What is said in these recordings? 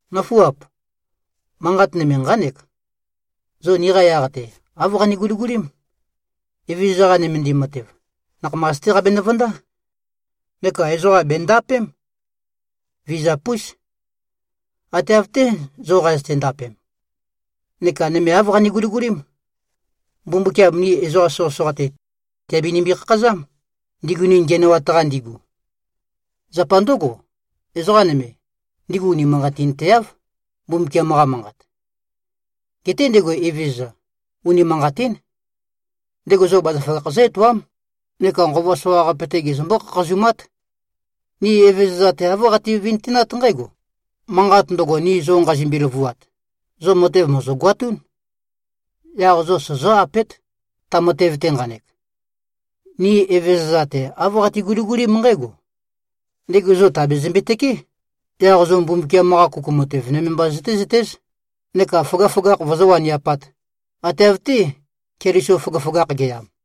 Nǿfuap! Manqat nøme nqánek: Zo niqa yaq-te, āv qane-guligulím: Evezøza-qa nømendim matev, nakhamas-té qabenø-vøndá. Neka ezoqa bèndapém. Vizap-ús. Ate av-té, zo qazøte-ndapem. Neka nøme āv qane-guligulím: Mbumbukiam ni ezoqa soqøsoqa-te, tèabinimbi-khakhazám, ndigu ni ngiænoat-qa ndigu. Zapa ndǿgo, ezoqa nøme, ndigu unimanqatinteáv, Mbumbukiam-qa Manqat. Geté ndego Evezøza, unimanqatín. Ndego zo bazaføgakh zǿ-etoám neka nqova soqaqape-te gezømbó-khakhazumát. Ni Evezøza-te āv qati-vintønat nqǽgo: Manqat ndøgo, ni zo nqazimbi-løvuat, zo matev mòzogoatún. Yaq zo sozó-apét, ta matev-te nqanek. Ni Evezøza-te āv qati-guligulím nqǽgo: Ndego zo tèabezømbe-tøkeé, yaq zo Mbumbukiam-qa kuku matev nøme mba zøtézøtéz, neka føgøføgakh vozó-waniapāt, ate av-té, Keliso føgøføgakh ge꞉yam.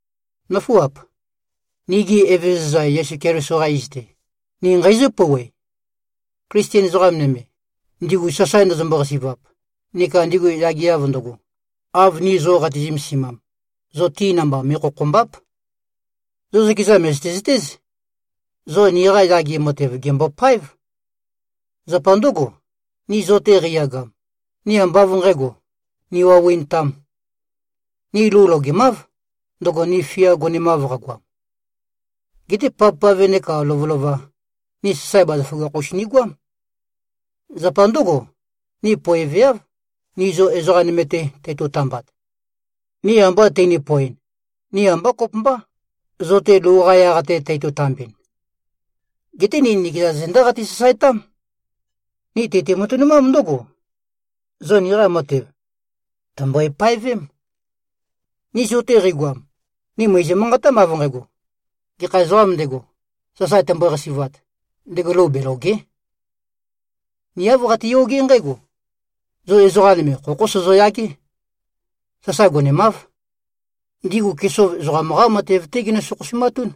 Nǿfuap! Nigi Evezøza Yesu Keliso-qa iz-te, ni nqeizǿ-pouwe: Klisten ezoqa nøme, ndigu sasae ndøzømbo-qasi꞉vap neka ndigu yageav ndøgo, av ni zo qati-zømesimam, zo ti namba me꞉khokhòmba᷄p. Zo zøkeza mø̀zøte-zøtéz, zo niqa yage matev gèmbopáev. Zapa ndǿgo, ni zo-te qeiyagam, ni ambá av nqǣgo, niwaui꞉ntām. Ni lou logemáv, ndøgo ni fia gonemav qagoam. Geté pavpave nekā lovølova, ni sasae bazaføgakh-us nigoám. Zapa ndǿgo, ni poeveáv, ni zo ezoqa nøme-te teito-tambat. Ni amba tøni-poeɨn, ni ambá kopømbá, zo-te lou-qa yaq-te teito-tambɨn. Geté ni nikeza zendá qati-sasaetám. Ni tøti-matønumám ndǿgo: Zo niqa matev, tø̀mbøe-paevém. Ni zo-te qeigoam, ni mø̀izø-manqatám, av nqægo: Gekha ezoqām ndego, sasae tømbøe-qasi꞉vat, ndego lou belòge᷄. Ni āv qatiyogé nqǽgo: Zo ezoqa nøme khokhó sozoyagé. Sasae gonemáv. Ndigu kesov ezoqam-qá matev-té ginø-sokhosumatún.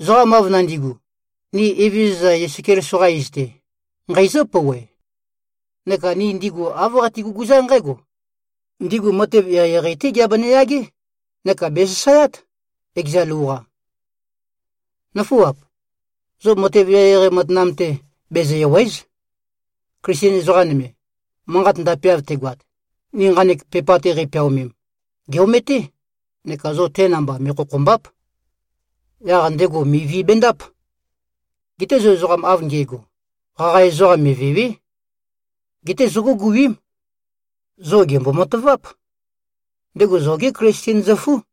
Ezoqam av nandi꞉gu, ni Evezøza Yesu Keliso-qa iz-te, nqeizǿ-pouwe, neka ni ndigu āv qati-guguzá nqǽgo: Ndigu matev eqeieqei-té giabenø-yagé neka bèsasaeát, ekeza lou-qa. Nǿfuap! Zo matev eqeieqei matanam-te bezø-èwe᷄z. Klisten ezoqa nøme, manqat ndapeav tegoat, ni nqanek pepa-te qeipeaomem, gè-ometé, neka zo te namba me꞉khokhòmba᷄p. Yaq ndego mivi bendáp. Geté zo ezoqam av nge꞉go, qaqa ezoqam mèvewe᷄. Geté zóguguím. Zo gèmbo-mataváp. Ndego zogé Klisten zøfú.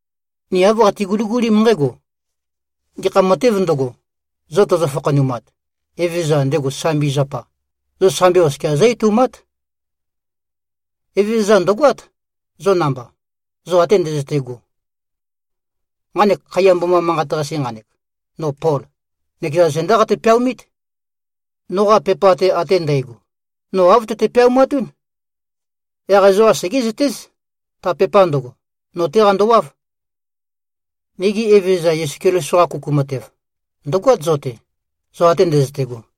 Ni āv qati-guligulím nqǽgo: Gekha matēv ndøgo, zo tøzø-fakhanumat, Evezøza, ndego sambi zapa, zo sambi oskia zǿ-etoumát. Evezøza ndø̀goát, zo namba, zo ate ndøzøte꞉go. Nqanek khaiya mboma manqat-qase nqanek, no Pol, nøkeza zendá qate-peaomít. Noqa pepa-te ate ndægo, no āv tøte-peaumatún. Yaq ezoqa segézøtéz, ta pepa ndøgo, no-té qandowáv. Nigi Evezøza Yesu Keliso-qa kuku matev, ndø̀goát, zo-te, zo ate ndøzøte꞉go.